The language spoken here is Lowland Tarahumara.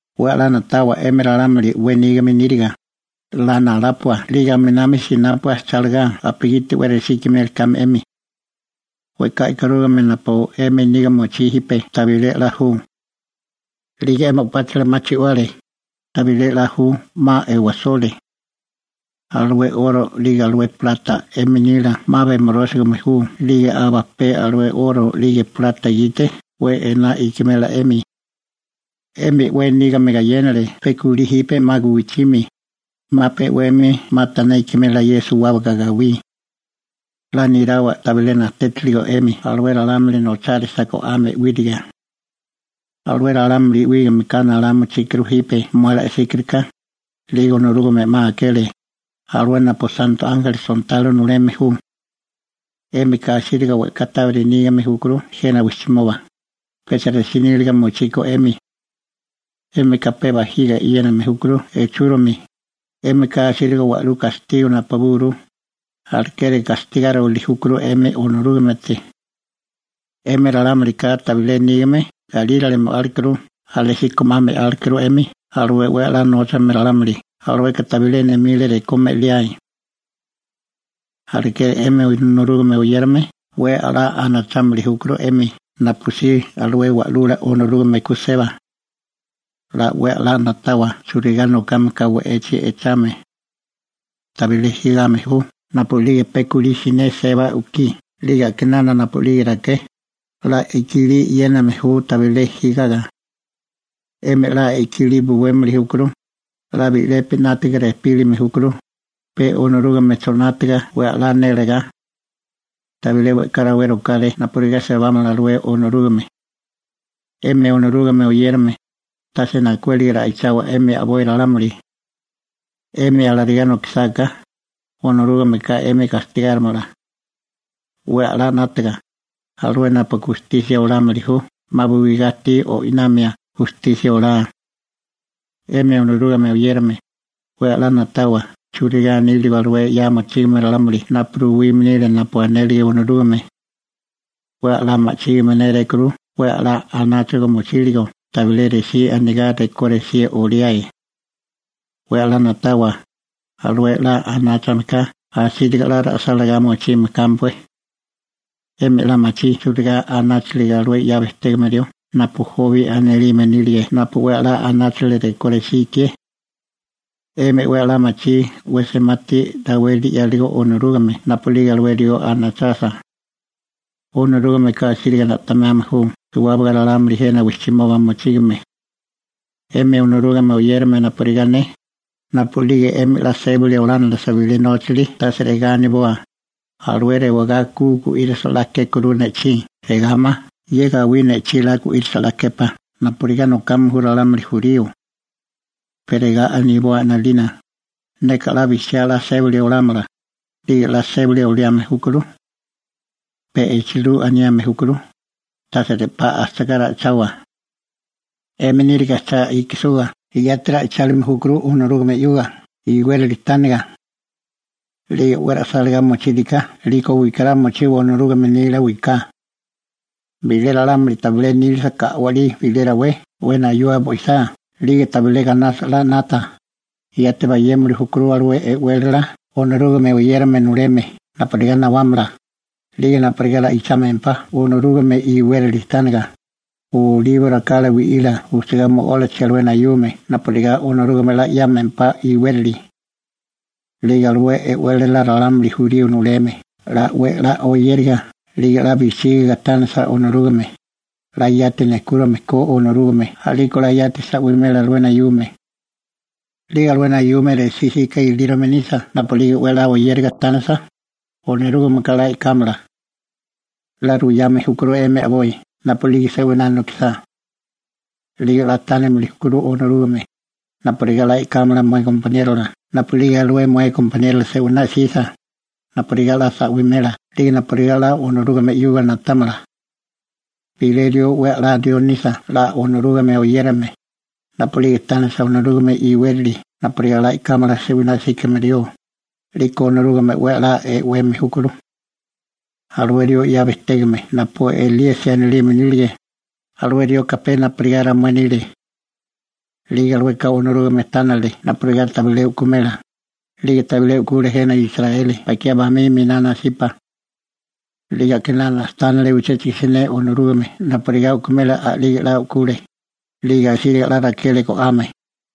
'We 'la na'tawa 'emi ralámuli 'we nígame níriga, 'la nalápua 'lige aminami sinápua chálagá napugiti 'we resí ikimeli kame 'emi. We'ká e'karúgame napu 'emi niga mochí jipe tabilé 'la ju. 'Lige 'emi o'páchila 'ma chi'wale, tabilé 'la ju, 'ma e'wasole. Alué 'oro 'lige alué plata 'emi nila 'ma bemorósigame ju 'lige aba pe alué 'oro 'lige plata gite 'we ená ikimela 'emi. 'Emi 'we nígame gayénale pe kulí jipe 'ma guwichimi, 'ma pe'wemi 'ma tané ikimela suwábaga ye gawí. 'La néláwa tabilé najtétiligo 'emi alué ralámuli nochárisa go'ame 'wíriga. Alué ralámuli 'wígameka nalá mochíkuru jipe mué la'síkiriká, 'lige Onorúgame 'ma akele, alué napu santo ánjeli sontalo nuleme ju. 'Émika asíriga we'ká tábiri nígame júkuru jena wijchimoba, pecha resí níliga mochiko 'émi. 'Émika pe bajiga e'yéname júkuru echúromi, 'émika asíriga wa'lú gastigo napabúguru, alekeri gastigáriwili júkuru 'emi Onorúgamete. 'Emi ralámulika tabilé nígame galírale mo'álekuru alésíko 'ma me'álekuru 'emi alué 'we 'la nóchame ralámuli, 'lige alueka tabilé nemile rekó me'liae. Alekeri 'emi Onorúgame oyérame 'we 'la anachámili júkuru 'emi napusí alué Wa'lula Onorúgame (Esusi) ku seba. 'La 'we 'la na'tawa churigá nokame ka we'echi echame. Tabilé jigame ju napu'lige pe kulí siné seba u'kí 'lige a'kinánami napu'lige raké, 'la i'kilí e'yéname ju tabilé jigaga. 'Emi 'la i'kilí buwémili júkuru, 'la bi'lepi 'nátiga rejpílime júkuru pe Onorúgamecho 'nátiga 'we 'la nélagá. Tabilé we'ká rawé rokáré napurigá sebámala alué Onorúgame. 'Emi Onorúgame oyérame, tase najkuéliga ra'ichawa 'emi a'boi ralámuli. 'Emi alarigá nokisáká, Onorúgameka 'emi gastigárimala. 'We 'la 'nátaga, alué napu gustisia olámili ju 'ma buigá ajtí o'inamia gustisia olá. 'Emi Onorúgame oyérame, 'we 'la na'tawa churigá níligo alué 'ya mochígame ralámuli napu ruwime nile napu anele Onorúgame. 'We 'la ma'chígame nérékuru 'we 'la anáchaga mochíligo tabilé resí anigá rekó resí oliáe. 'We 'la na'tawa, alué 'la anáchameka asíriga 'la ra'sálagá mochime kámpué. 'Emi 'la machí churigá anáchiligo alué 'ya bejtégame rió napu Jobi anilime nílige napu 'we 'la anáchale rekó resí ikié. 'Emi 'we 'la machí 'we semati raweli 'yáligo Onorúgame napu'lige alué rió anachasa. Onorúgameka asíriga na'temame ju suwábaga ralámuli jena wijchimoba mochígame. 'Emi Onorúgame oyérame napurigá ne, napu'lige 'emi 'la sébali olánilisa bilé nóchali tase regá aniboa: «Alué rewagá 'la gu'írisa 'la kékuru ne'chí», regá ma: «Ye gawí ne'chí 'la gu'írisa, 'la képá», napurigá nokame ju ralámuli jurío. Pe regá aniboa 'nalina: «Neka 'la bijchiá 'la sébali olámala», 'lige 'la sébali oliame júkuru. Pe echilú aniame júkuru, tase re'pá ajchigá ra'ichawa. 'Emi níriga cha ikisuga yati ra'ichálime júkuru Onorúgame 'yuga iwérali tániga. 'Lige 'we ra'sálagá mochíriká 'liko wikará mochiwa Onorúgame nila wiká. Bilé ralámuli tabilé nílisaká a'walí bilé rawé 'we nayua bo'isá 'lige tabilé gainasa 'la 'nata, yati bayémili júkuru alué e'wélala Onorúgame oyérame nuleme napurigá nawámala, 'lige napurigá ra'ichámempá Onorúgame iwérali tániga, olibo rakala wi'ila ujchegá mo'ólachi alué nayume napurigá Onorúgame 'la 'yámempá iwérali. 'Lige alué e'wélala jurío ralámuli nuleme 'la 'we 'la oyériga 'lige 'la bijchígiga tánisa Onorúgame, 'la yati nejkúrome ko Onorúgame, a'liko 'la yati sa'wimela alué nayume. 'Lige alué nayume resí 'sika ilírome nisa napu'lige 'we 'la oyériga tánisa, Onorúgameka 'la e'kámala. 'La ruwame júkuru 'emi a'boi napu'lige se'winá nokisá. 'Lige 'la tánilime júkuru Onorúgame napurigá 'la e'kámala mué gompaniérola napu'lige alué mué gompaniérola se'winá 'sisa, napurigá 'la sa'wimela 'lige napurigá 'la Onorúgame 'yuga na'támala. Bilé rió 'we 'la rió nisa 'la Onorúgame oyérame, napu'lige tánisa Onorúgame iwélali napurigá 'la e'kámala se'winá 'síkame rió, 'liko Onorúgame 'we 'la e'weme júkuru. Alué rió 'ya bejtégame napu Elíasi anilime nílige, alué rioka pe napurigá ramué nile. 'Lige alueka Onorúgame tánile napurigá tabilé u'kumela, 'lige tabilé u'kule jena Israeli bakiá bamí miná nasipa. 'Lige a'kinana tánile uchéchigo siné Onorúgame napurigá u'kumela a'lige 'la u'kule, 'lige asíriga 'la rakele go'ame.